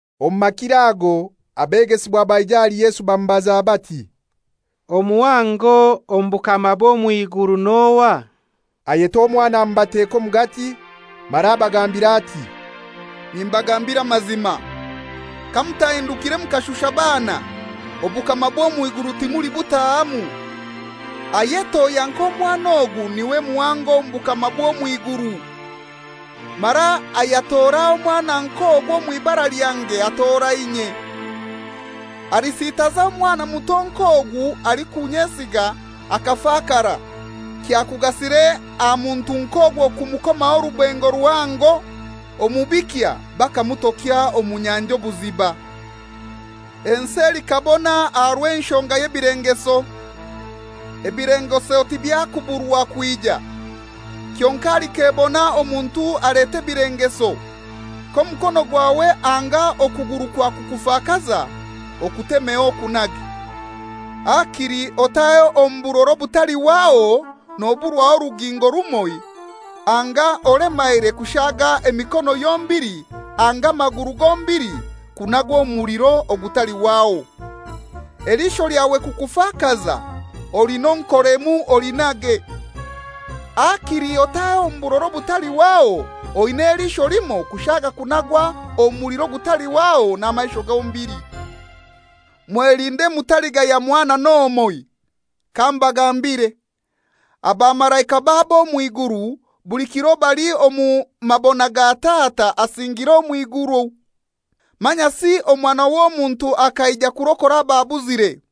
Omu makiro ago abegesibwa baija ahali Yesu bamubaza bati, «Omuhango omu bukama bw'omw'iguru n'ohai?» Ayeta omwana amubateka omugati, mara abagambira ati, «Nimbagambira amazima, kamutahindukire mukashusha baana, obukama bw'omw'iguru timulibutahamu. Ayetohya nk'omwana ogu niwe muhango omu bukama bw'omw'iguru. Mara ayatora omwana nk'ogu omw'ibara lyange atora inye.» «Alisitaza omwana muto nk'ogu alikunyesiga akafakara, kyakugasire aha muntu nk'ogwo kumukoma orubengo ruhango omu bikya bakamutokya omu nyanja obuziba. Ensi elikabona aha rw'enshonga y'ebilengeso. Ebilengeso tibyakuburwa kwija. Kyonkai alikebona omuntu aleta ebilengeso. K'omukono gwawe anga okuguru kwakukufakaza, okutemeho okunage. Hakili otahe omu burora obutalihwaho noburwaho orugingo rumoi anga olemaire kushaga emikono yombili anga amaguru gombili kunagwa omu muliro ogutalihwaho. Eliisho lyawe kukufakaza, olinonkoremu olinage. Hakili otahe omu burora obutalihwaho oina eliisho limoi kushaga okunagwa omu muliro ogutalihwaho n'amaisho gombili.» «Mwelinde mutaligaya mwana n'omoi. Kambagambire, abamalaika babo omw'iguru buli kiro bali omu mabona ga Tata asingiire omw'iguru. [Manyasi Omwana w'Omuntu akaija kurokora ababuzire.]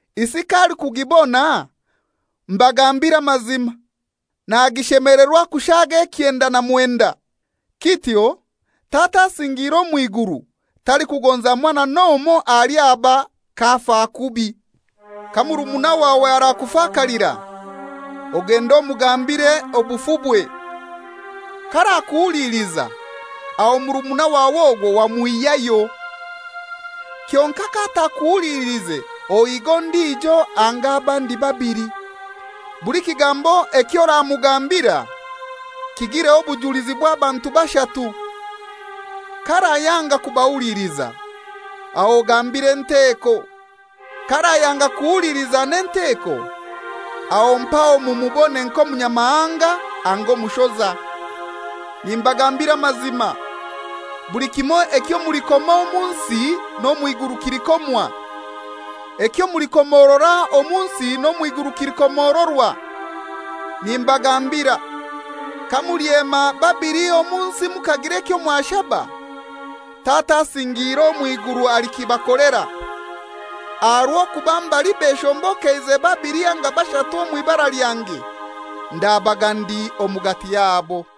Isi k'alikugibona, mbagambire amazima, nagishemelerwa kushaga ekyenda na mwenda. Kityo Tata asingiire omw'iguru talikugonza mwana n'omoi ahali aba k'afa kubi.» «Ka murumuna wawe arakufakalira, ogende omugambire obufubwe. K'arakuhuliliza, aho murumuna wawe ogwo wamwihyayo. Kyonkai k'atakuhuliliize ohiige ondijo anga abandi babili, buli kigambo eky'oramugambira kigireho obujulizi bw'abantu bashatu. K'arayanga kubahuliliza, aho ogambire enteko. K'arayanga kuhuliliza n'enteko, aho mpaho mumubone nk'omunyamahanga anga omushoza. Nimbagambira amazima, buli kimoi ekyo mulikoma omu nsi n'omw'iguru kilikomwa. Ekyo mulikomorora omu nsi n'omw'iguru kilikomororwa. Nimbagambira, kamulyema babili omu nsi mukagira ekyo mwashaba, Tata asingiire omw'iguru alikibakolera. Aha rw'okuba mbali beshombokeize babili anga bashatu omw'ibara lyange, ndabaga ndi omugati yabo.»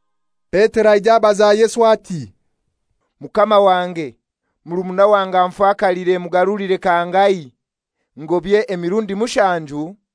Petero aija abaza Yesu ati, «Mukama wange, murumuna wange anfakaliire mugarulire kangahai? Ngobye emirundi mushanju?»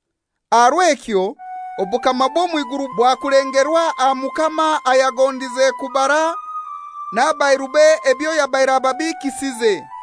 «Aha rw'ekyo obukama bw'omw'iguru bwakulengerwa aha mukama ayagondize kubara n'abairube ebyo yabaire ababiikisize.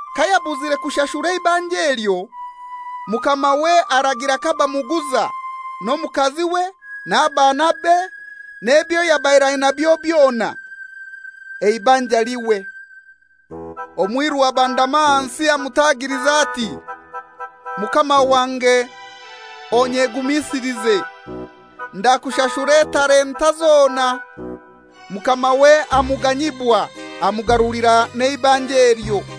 Kayabuzire kushashura eibanja elyo mukamawe aragira kabamuguza, n'omukaziwe n'abaanabe n'ebyo yabaire ainabyo byona, eibanja lihwe. Omwiru abandama ahansi amutagiliza ati, ‹Mukama wange onyegumisilize, ndakushashura etalenta zona.› Mukamawe amuganyibwa amugarulira n'eibanja elyo.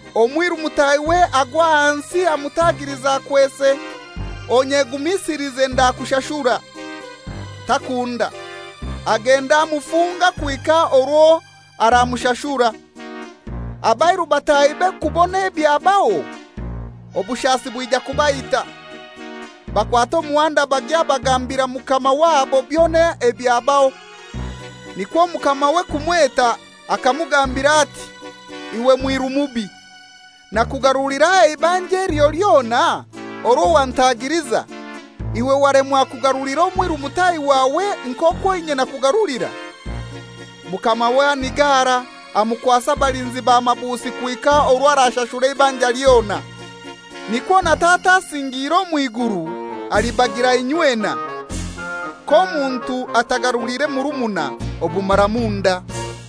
Omwiru mutahiwe agwa ahansi amutagiliza akwese, ‹Onyegumisilize ndakushashura.› Takunda, agenda amufunga kuhika orwo aramushashura. Abairu batahibe kubona ebyabaho, obushasi bwija kubaita. Bakwata omuhanda bagya bagambira mukama wabo byona ebyabaho. Nikwo mukamawe kumweta akamugambira ati, ‹Iwe mwiru mubi! Nakugarulira eibanja elyo lyona orwo wantagiliza; iwe walemwa kugarulira omwiru mutahi wawe nk'okwo inye nakugarulira?› Mukamawe anigara, amukwasa abalinzi ba mabusi kuhika orwo arashashura eibanja lyona. Nikwo na Tata asingiire omw'iguru alibagira inywena, k'omuntu atagaruliire murumuna obumaramunda.»